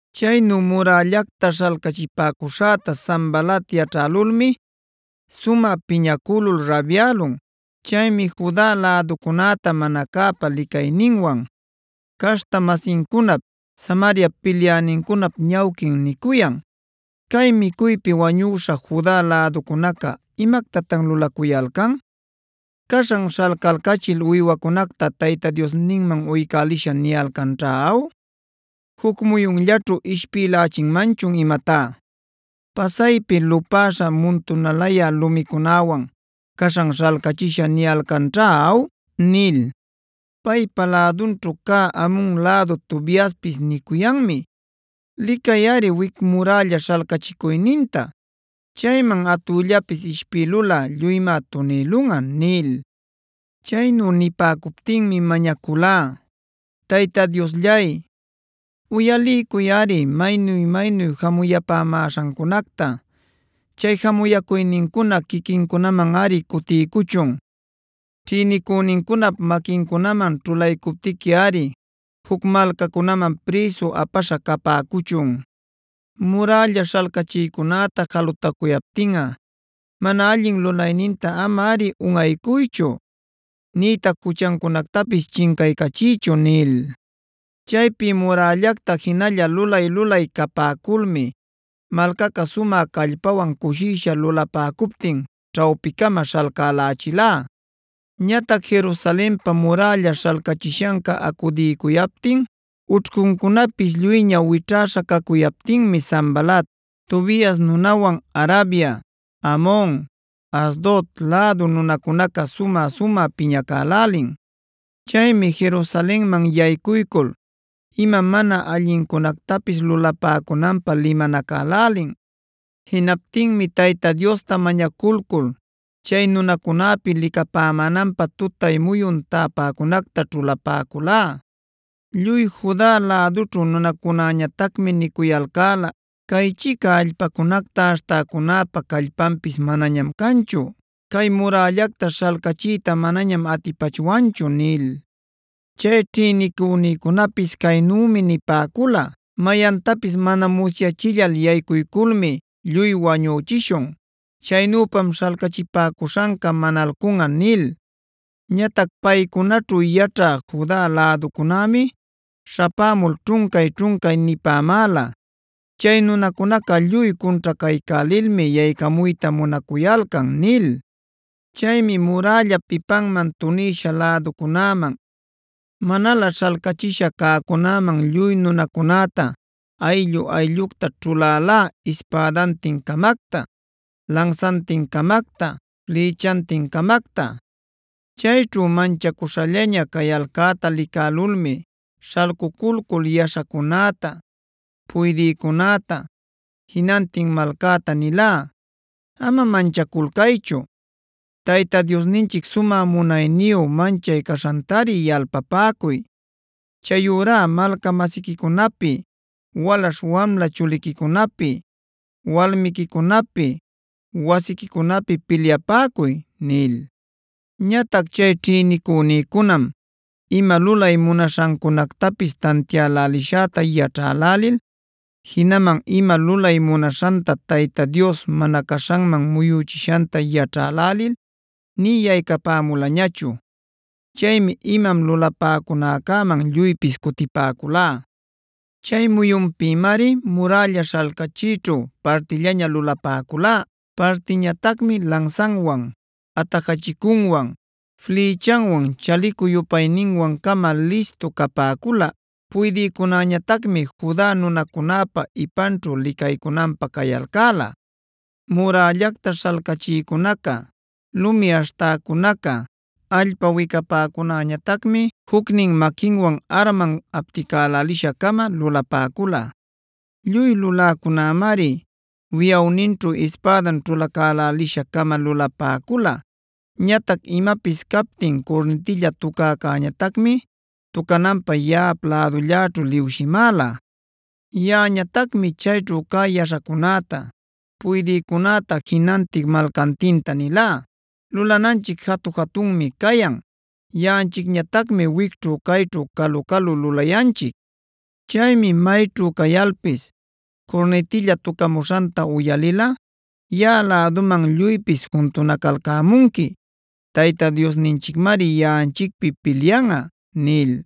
Chaynu murällacta śhalcachipäcuśhäta Sanbalat yaćhälulmi sumä piñacülul rabyälun. Chaymi Juda läducunäta mana cäpa licayninwan, caśhta-masincunap, Samariap pilyänincunap ñawquin nicuyan: “¿Cay micuypi wañüśha Juda läducunaca imactatan lulacuyalcan? ¿Caśhan śhalcalcachil uywacunacta Tayta Diosninman ‘uycälishä’ niyalcanćha aw? ¿¡Juc muyunllaćhu ishpïlächinmanchun imatá!? ¿¡Pasaypi lupäśha muntunalayä lumicunäwan caśhan śhalcächisha niyalcanćha aw!?” nil. Paypa lädunćhu cä Amon lädu Tobiaspis nicuyanmi: “Licayꞌari wic murälla śhalcachicuyninta. Chayman atüllapis ishpïlulꞌa lluymá tunïlunꞌa” nil. Chaynu nipäcuptinmi mañaculá: “Tayta Diosllay, uyaliycuyꞌari maynu-maynu jamuyapämaśhancunacta. Chay jamuyäcuynincuna quiquincunamanꞌari cutiycuchun. Ćhïnicünincunap maquincunaman ćhulaycuptiquiꞌari juc malcacunaman prïsu apäśha capäcuchun. Murälla śhalcachïcunäta jalutacuyaptinꞌa mana allin lulayninta amari unꞌaycuychu, nïtac juchancunactapis chincaycachiychu” nil. Chaypi murällacta jinalla lulay-lulay capäculmi malcaca sumä callpawan cushisha lulapäcuptin ćhawpicama śhalcälächilá. Ñatac Jerusalenpa murälla śhalcachishanca acudiycuyaptin, ućhcuncunapis lluyña wićhäśha cacuyaptinmi Sanbalat, Tobias nunawan Arabia, Amon, Asdod lädu nunacunaca sumä-sumä piñacälälin. Chaymi Jerusalenman yaycuycul ima mana allincunactapis lulapäcunanpä limanacälälin. Jinaptinmi Tayta Diosta mañaculcul chay nunacunäpi licapämänanpä tutay muyun täpäcunacta ćhulapäculá. Lluy Juda lädućhu nunacunäñatacmi nicuyalcäla: “Caychica allpacunacta aśhtäcunäpa callpanpis manañam canchu; cay murällacta śhalcachiyta manañam atipachwanchu” nil. Chay ćhïnicünïcunapis caynümi nipäcula: “Mayantapis mana musyachillal yaycuyculmi lluy wañüchishun. Chaynüpam śhalcachipäcuśhanca manalcunꞌa” nil. Ñatac paycunaćhu yaćhä Juda läducunämi śhapämul ćhuncay-ćhuncay nipämäla: “Chay nunacunaca lluy cunćhacaycälilmi yaycamuyta munacuyalcan” nil. Chaymi murällap ipanman tunïsha läducunäman, manalä śhalcachisha cäcunäman lluy nunacunäta ayllu-ayllucta ćhulälá ispädantin-camacta, lansantin-camacta, flïchantin-camacta. Chayćhu manchacuśhallaña cayalcäta licälulmi śhalcuculcul yaśhacunäta, puydïcunäta, jinantin malcäta nilá: “Ama manchaculcaychu. Tayta Diosninchic sumä munayniyu manchay caśhantari yalpapäcuy. Chayurá malca-masiquicunapi, walaśh-wamla chuliquicunapi, walmiquicunapi, wasiquicunapi pilyapäcuy” nil. Ñatac chay ćhïnicünïcunam ima lulay munaśhancunactapis tantiälälishäta yaćhälälil, jinaman ima lulay munaśhanta Tayta Dios mana caśhanman muyuchishanta yaćhälälil nï yaycapämulañachu. Chaymi imam lulapäcunäcäman lluypis cutipäculá. Chay muyunpïmari murälla śhalcachiyćhu partillaña lulapäcula. Partiñatacmi lansanwan, atajachicunwan, flïchanwan chalicu-yupayninwan-cama listu capäcula. Puydïcunäñatacmi Juda nunacunäpa ipanćhu licaycunanpä cayalcäla. Murällacta śhalcachïcunaca, lumi aśhtäcunaca, allpa wicapäcunäñatacmi jucnin maquinwan arman apticälälisha-cama lulapäcula. Lluy luläcunämari wiꞌawninćhu ispädan ćhulacälälisha-cama lulapäcula. Ñatac imapis captin curnitilla tucäcäñatacmi tucananpä yaꞌap lädulläćhu liwshimäla. Yaꞌañatacmi chayćhu cä yaśhacunäta, puydïcunäta jinantin malcantinta nilá: “Lulananchic jatu-jatunmi cayan. Yaꞌanchicñatacmi wicćhu cayćhu calu-calu lulayanchic. Chaymi mayćhu cayalpis curnitilla tucamuśhanta uyalilꞌa yaꞌa läduman lluypis juntunacalcämunqui. Tayta Diosninchicmari yaꞌanchicpi pilyanꞌa” nil.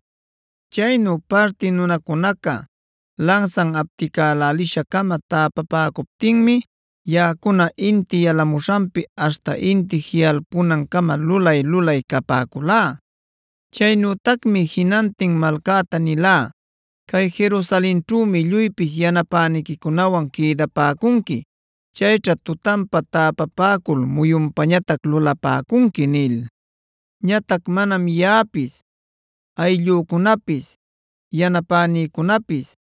Chaynu parti nunacunaca lansan apticälälisha-cama täpapäcuptinmi yaꞌacuna inti yalamuśhanpi aśhta inti jiꞌalpunancama lulay-lulay capäculá. Chaynütacmi jinantin malcäta nilá: “Cay Jerusalenćhümi lluypis yanapäniquicunawan quïdapäcunqui. Chayćha tutanpa täpapäcul muyunpañatac lulapäcunqui” nil. Ñatac manam yaꞌapis, ayllücunapis, yanapänïcunapis,